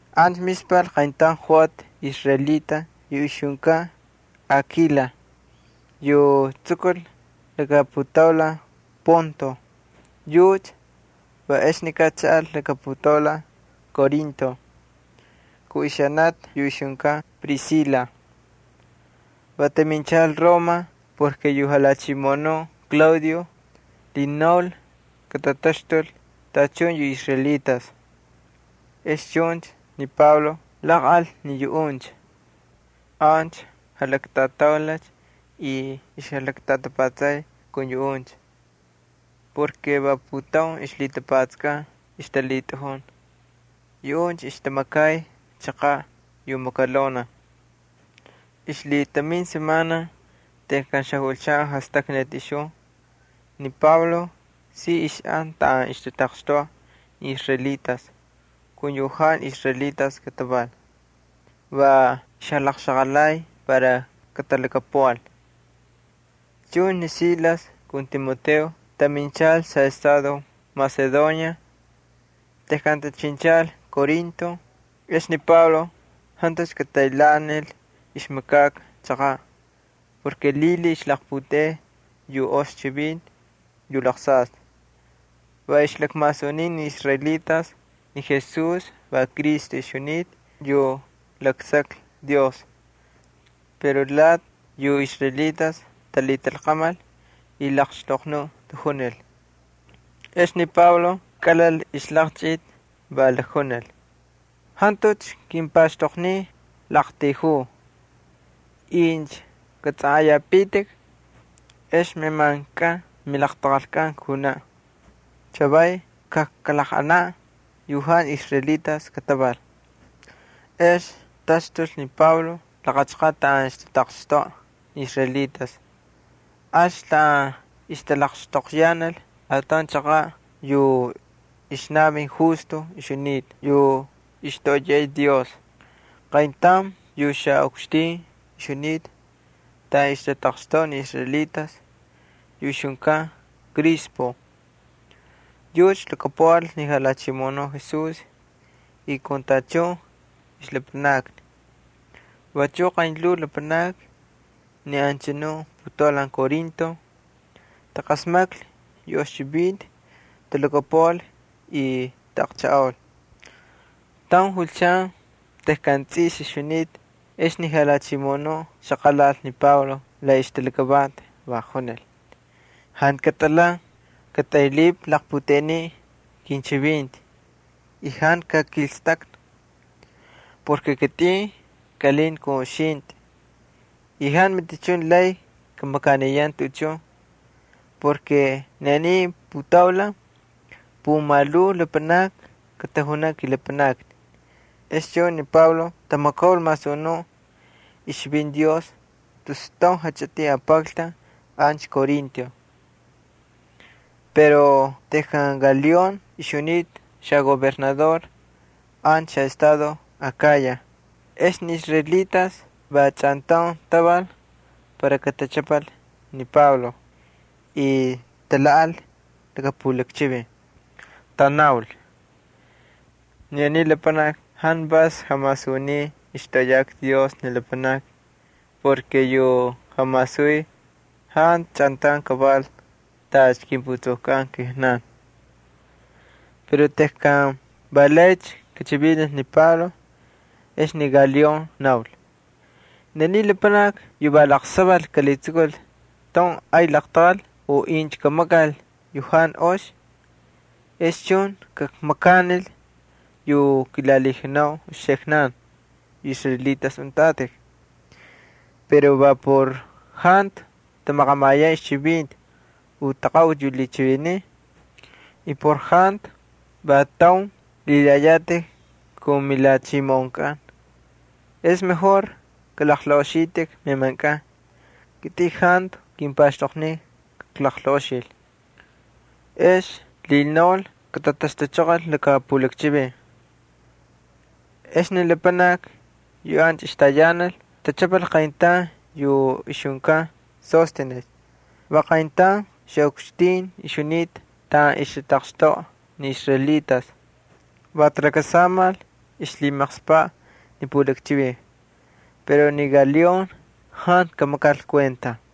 Ancha mispal qayntaun joꞌati israelita yu ixjunkan Akila yu tsukul laka putaulan Ponto. Yucha va exnikaꞌ chaꞌal laka putaulan Corinto kun ixanati yu ixjunkan Prisila. Va taminchal Roma porke yu jalhachimoꞌonuꞌ Claudio lhinaul katataxtul tachun yu israelitas. Ex chuncha ni Pablo jalaqꞌal ni yuꞌuncha. Ancha jalaktꞌataulalcha y ixjalaktꞌatapatsay kun yuꞌuncha porke va putaun ixlhitapatsakꞌan ixtalhitꞌajun. Yuꞌuncha ixtamakay chaqaꞌ yu makalonaj. Ixlhitamin semana tejkan xajulchan jastaknati ixjun, ni Pablo si ixꞌan taꞌan ixtataqxtoꞌa ni israelitas kun yu jantu israelitas kataval. Va ixjalaqxaqalay para katalhakapuꞌal. Chuncha ni Silas kun Timoteo taminchal xaꞌestado Macedonia. Tejkan tachinchal Corinto, ex ni Pablo jantucha kataylhaanil ixmakaka chaqaꞌ porke lhilhiy ixlaqputeꞌey yu ox chivinti yu laqsaystꞌi. Va ixlakmasuniy ni israelitas ni Jesús va Cristo ixjunita yu laksaklhi Dios. Pero lati yu israelitas talhitalqamal y laqxtoqnuꞌ tajunil. Ex ni Pablo kꞌalhal ni ixlaqchꞌiti, va lakjunil: —Jantucha kimpaxtoqniy klaꞌaqtayjuu. Incha katsꞌanꞌayapitik, ex meꞌemanchkꞌan milaqtaqalkꞌan kunaꞌ. Chavaycha kajkalaqꞌanaꞌ yu jantu israelitas kataval. Ex taxtulcha ni Pablo laqa chaqaꞌ taꞌan ixtataqxtoꞌa ni israelitas, alcha taꞌan ixtꞌalaqxtoqyanal ataun chaqaꞌ yu ixnavin ixjunita ni Justo yu ixtoꞌoyay Dios. Yu xaꞌukxtin ixjunita taꞌan ixtataqxtoꞌa ni israelitas va ixjunkan Crispo. Yucha lhakapuꞌal ni Jalhachimoꞌonuꞌ Jesús, vachuꞌ talhakapuꞌal tachun ixlapanakni. Vachuꞌ qaynlhuu lapanakni ni anchanu putaulan Corinto taqasmaklhi yu ox chivinti talhakapuꞌal y taꞌaqchajꞌaul. Tauncha julchan tejkan tsꞌis ixjunita ex ni Jalhachimoꞌonuꞌ xaqalal ni Pablo la ixtalakavanti, va junil: —Jantu katꞌalhan. Katꞌaylhipꞌi laqputeꞌeniꞌ kinchivinti, y jantu kakꞌikstꞌaktꞌi. Kitꞌin kꞌalinta kun uxintꞌi y jantu matichun lay kamakaniyan tuꞌuchun. Ni aniy putaulan pumalhuu lapanakni katajunaꞌ kilapanakni. Ex chuncha ni Pablo tamakaul masunuꞌ ixchivinti Dios tus taun jachꞌitin apakltaun ancha Corinto. Pero tejkan Galión ixjunita xagobernador ancha xaꞌestado Akaya ex ni israelitas va chꞌantaun taval para katachꞌapal ni Pablo, y talhaꞌal laka pulakchivin. Tanaul: —Ni aniy lapanaki jantu vas jamasuniy ixtoꞌoyaka Dios ni lapanakni. Yu jamasuniy jantu chꞌantaun kaval tacha kimputsukkꞌan kijnan. Pero tejkan va laycha kachivinil ni Pablo ex ni Galión naul: —Incha aniy lapanaki va laqsaval kalhitsukul taun ay laqtaqal u incha kamakal yu jantu ox, ex chun kakmakanil yu kilalhijunau uxiknan yu israelitas untꞌatꞌik. Pero va por jantu tamaqamayan ixchivinti u ni taqaꞌuti yu lhichiviniy y por jantu va taun lhilayatꞌik kun milhachimoꞌonkꞌan. Ex kalaqlaꞌoxitꞌik meꞌemankꞌan. Kitꞌin jantu kimpaxtoqniy kaklaqlaꞌoxil. Ex lhinaulcha katataxtuchoqol laka pulakchivin. Ex ni lapanakni yu ancha ixtayanal tachꞌapal qayntaun yu ixjunkan Sóstenes va qayntaun xaꞌukxtin ixjunita taꞌan ixtataqxtoꞌa ni israelitas. Va talakasamal ixlhimaqspaꞌ ni pulakchivin. Pero ni Galión jantu kamakal kuenta.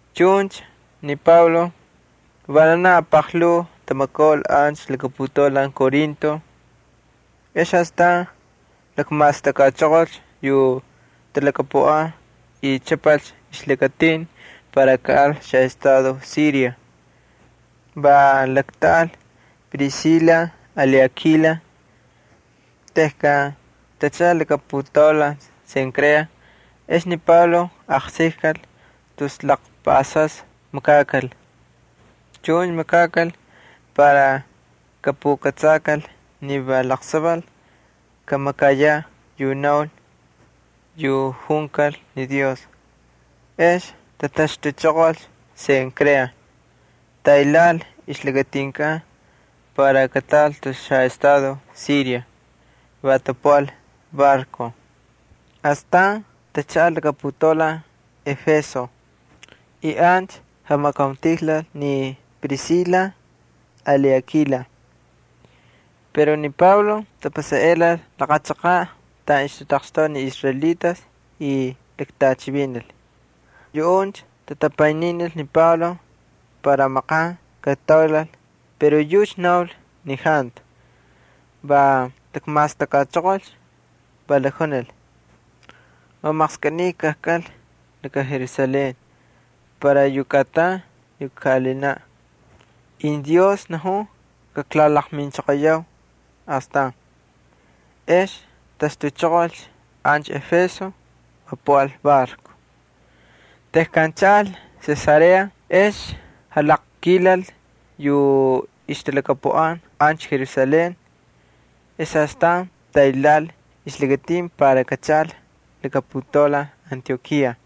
Chuncha ni Pablo vananaj apaqlhuu tamakaul ancha laka putaulan Corinto. Ex astan lakmastakꞌachoqolcha yu talhakapuꞌan y chꞌapalcha ixlakatinkꞌan para kaꞌal xaꞌestado Siria. Va laktꞌaꞌal Prisila ali Akila. Tejkan tachaꞌal laka putaulan Cencrea ex ni Pablo aqsikkal tus laqpaꞌasas makakal. Chuncha makakal para kapukꞌatsakal ni va laqsaval kamakayaꞌ yu naul, yu junkal ni Dios. Ex tataxtuchoqolcha Cencrea, tataylhaꞌal ixlakatinkꞌan para kataꞌal tus xaꞌestado Siria. Va tapuꞌal barco. Astan tachaꞌal laka putaulan Éfeso y ancha jamakauntijlal ni Prisila ali Akila. Pero ni Pablo tapasaꞌelal laqa chaqaꞌ taꞌan ixtataqxtoꞌa ni israelitas y laktꞌachivinil. Yuꞌuncha tatapayninil ni Pablo para maqan kataulal pero yucha naul ni jantu. Va lakmastakꞌachoqolcha, va lakjunil: —[Va maqskꞌiniy kajkꞌal laka Jerusalén para yu kꞌatan yu kaꞌalinaꞌ.] Incha Dios najun, kaklalaqminchoqoyau astan. Ex taxtuchoqolcha ancha Éfeso, va puꞌal barco. Tejkan chaꞌal Cesarea ex jalaqkilal yu ixtalhakapuꞌan ancha Jerusalén ex astan taylhaꞌal ixlakatin para kachaꞌal laka putaulan Antiokía.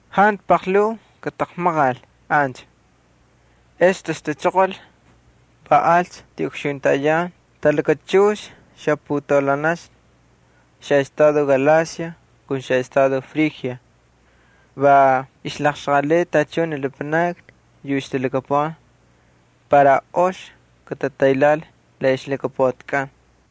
Jantu paqlhuu kataqmaqal ancha, ex taxtuchoqol, va alcha tiꞌukxuntayan talakachux xaputaulanaxna xaꞌestado Galacia kun xaꞌestado Frigia. Va ixlaqxaqalay tachun ni lapanakni yu ixtalhakapuꞌan para ox katataylhaꞌal la ixlhakapuꞌatikꞌan.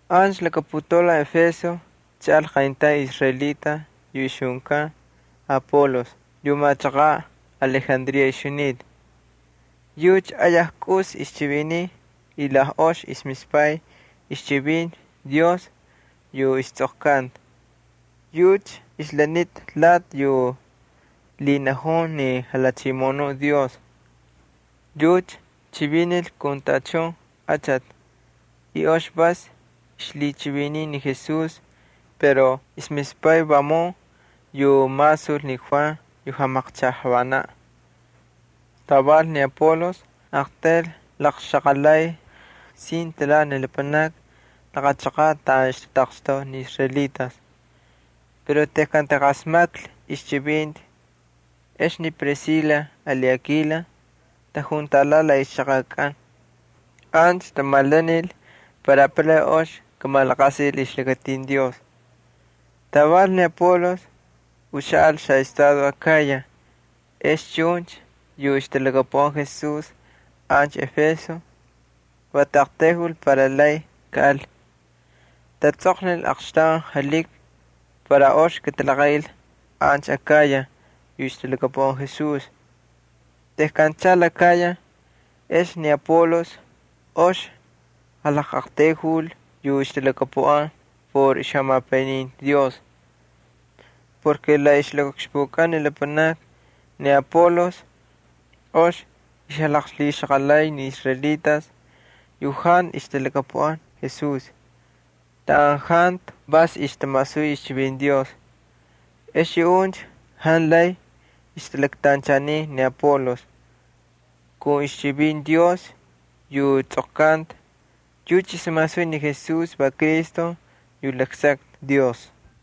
Ancha laka putaulan Éfeso chaꞌal qayntaun israelita yu ixjunkan Apolos yu machaqaꞌ Alejandría ixjunita. Yucha ayaj kꞌusi ixchiviniy y la ox ixmispay ixchivinti Dios yu istsꞌoqkanta. Yucha ixlanita lati yu lhinajun ni Jalhachimoꞌonuꞌ Dios. Yucha chivinil kun tachun achati y ox vas ixlhichiviniy ni Jesús pero ixmispay vamun yu masul ni Juan yu jamaqchajꞌavanan. Taval ni Apolos aqtayl laqxaqalay sin talhanti ni lapanakni laqa chaqaꞌ taꞌan ixtataqxtoꞌa ni israelitas. Pero tejkan taqasmaklhi ixchivinti ex ni Prisila ali Akila tajuntalhaꞌal la ixchaqakꞌan. Ancha tamalanil para apalay ox kamalaqasil ixlakatin Dios. Taval ni Apolos uxaꞌal xaꞌestado Akaya ex chuncha yu ixtalhakapuꞌan Jesús ancha Éfeso va taꞌaqtayjul para lay kaꞌal. Tatsꞌoqnil aqxtaun jalhiki para ox katalaqaꞌil ancha Akaya yu ixtalhakapuꞌan Jesús. Tejkan chaꞌal Akaya, ex ni Apolos ox jalaqꞌaqtayjul yu ixtalhakapuꞌan por ixjamapayninti Dios. La ixlakaꞌukxpukꞌan ni lapanakni ni Apolos ox ixjalaqlhixaqalay ni israelitas yu jantu ixtalhakapuꞌan Jesús taꞌan jantu vas ixtamasuy ixchivinti Dios. Ex yuꞌuncha jantu lay ixtalaktanchaniy ni Apolos. Kun ixchivinti Dios yu tsꞌoqkanta yucha ixmasuy ni Jesús va Cristo yu laksakta Dios.